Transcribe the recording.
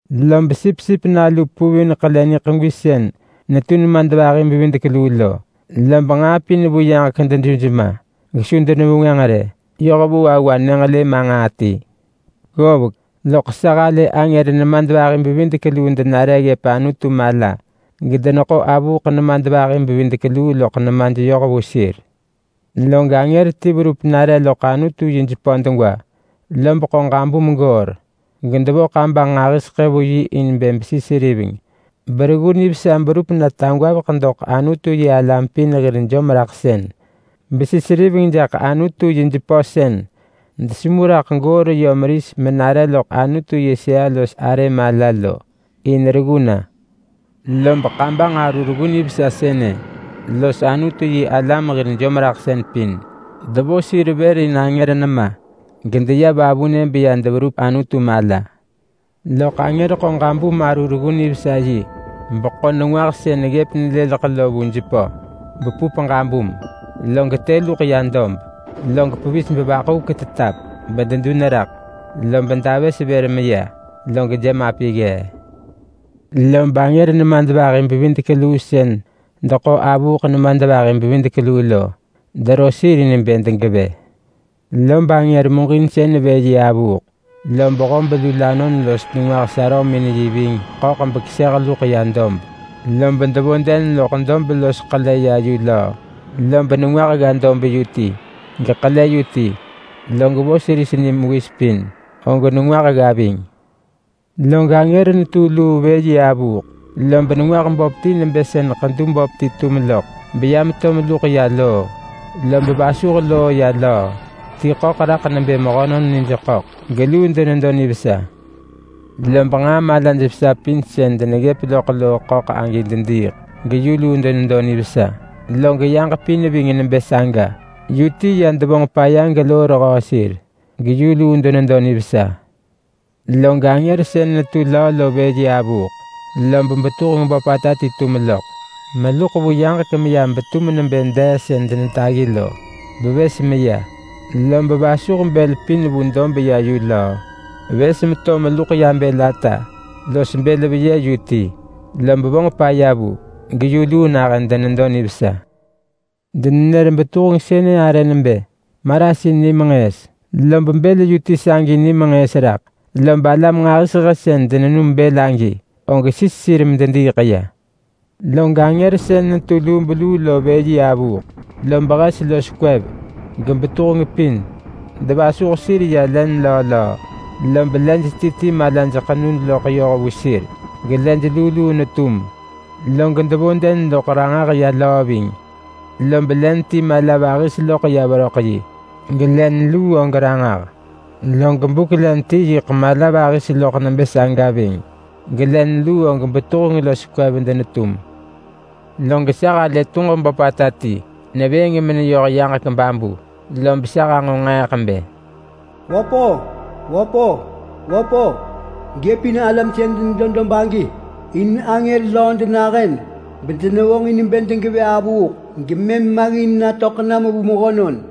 Log Sipsip Nalu puvin ḳele niḳegwi sën netu nemadvahi bevidek luu lo, lob nġaa pin vu yaġek deduj ma gesu denevengwënġ rë yoh vu awa nyënġelë ma nġaa ti. Ggovek loḳ sa halë angër nemadvahi-bevidek-luu denare ggëp Anutu mala, gedeneḳo avuuḳ nemadvahi-bevidek-luu loḳ nemaj yoh vu sir. Log angër ti verup nare loḳ Anutu yi jepö degwa. Lob ḳo ġabum goor gedevo kabanġ nġahiseḳë vu yi in besi seriveng bereggu nivesa berup na tagwaveḳ doḳ Anutu-yi-alam pin hir jomraḳsën. Besi seriveng jaḳ Anutu yi jepö sën desemu raḳ goor yö meris menare loḳ Anutu yi sëa-los-arë mala lo, in reggu na. Lob kabanġ aru reggu nivesa sënë los Anutu-yi-alam hir jomraḳsën pin devo sir vër in angër nema, gedeya vavunë beya deverup Anutu mala. Loḳ angër ḳo ġabum-aru-reggu-nivesa-yi beḳo nengwah sën ggëp neleleḳ lo vu jepö bepup ġabum, log të luḳ ya dob. Log pevis bevaḳuvek tetap bededun raḳ, lob davës vër meya, log jemapi ggee. Lob angër nemadvahi-bevidek-luu sën deḳo avuuḳ nemadvahi-bevidek-luu lo dero sir in bë degevë. Lob angër muġinsën vë yi avuuḳ, lob hob lulanon los nengwah sarömin yi ving ḳöḳ bekeseh luḳ ya dob. Lob devo den loḳ dob los ḳele ya yu löö, lob nengwah gga dob yu ti, geḳele yu ti. Log vos ris ni mewis pin, og nengwah gga ving. Log angër netu luu vë yi avuuḳ lob nengwah böp ti nebë sën ḳedu böp ti tum loḳ, beya meto meluḳ ya loo, lob vasuh loo ya löö. Ti ḳöḳ raḳ nebë mehönon nij ḳöḳ geluu denedo nivesa. Lob nġaa malaj vesa pin sën deneggëp loḳ loo ḳöḳ agi dediiḳ geyu luu denedo nivesa. Log yaġ pin ving nebë saga, yu ti ya devonġ paya geloo rehöö sir, geyu luu denedo nivesa. Log angër sën netu löö lo vë yi avuuḳ, lob betuheng böpata ti tum loḳ meluḳ vu yaġek meya betum nebë dee sën denetaggi lo, bevës meya. Lob vasuh bël pin vu dob ya yu löö. Vës meto meluḳ ya bël ata los bël veyë yu ti lob vonġ paya vu, geyu luu nahën denedo nivesa. Denenër betuheng sënë arë nebë Marasin Nimenġëës, lob bël yu ti sagi ni menġëës raḳ. Lob alam nġahiseḳë sën denenum bël agi, og sis sir medediiḳ ya. Log angër sën netu lubeluu lo vë yi avuuḳ, lob hes los kwev, gebetuheng pin devasuh sir ya len löö löö. Lob lej ti ti malaj ḳenu loḳ yoh vu sir gelej luu luu netum. Log devo den loḳ ranġah ya löö ving. Lob len ti mala vahis loḳ ya veröḳ yi gelen luu og ranġah. Log buk len ti yiḳ mala vahis loḳ nebë saga ving, gelen luu og betuheng los kwev denetum. Log sa halë tuġ böpata ti nevëëng meneyoh yaġek babu. Lob sa hanġo nġeeḳ bë, “Wöp-o! Wöp-o! Wöp-o! Gëpin alam sën denedo dob agi! In angër löö denahën bedenevonġin bë degevë avuuḳ gemëm maggin natöḳ nam vu mehönon!”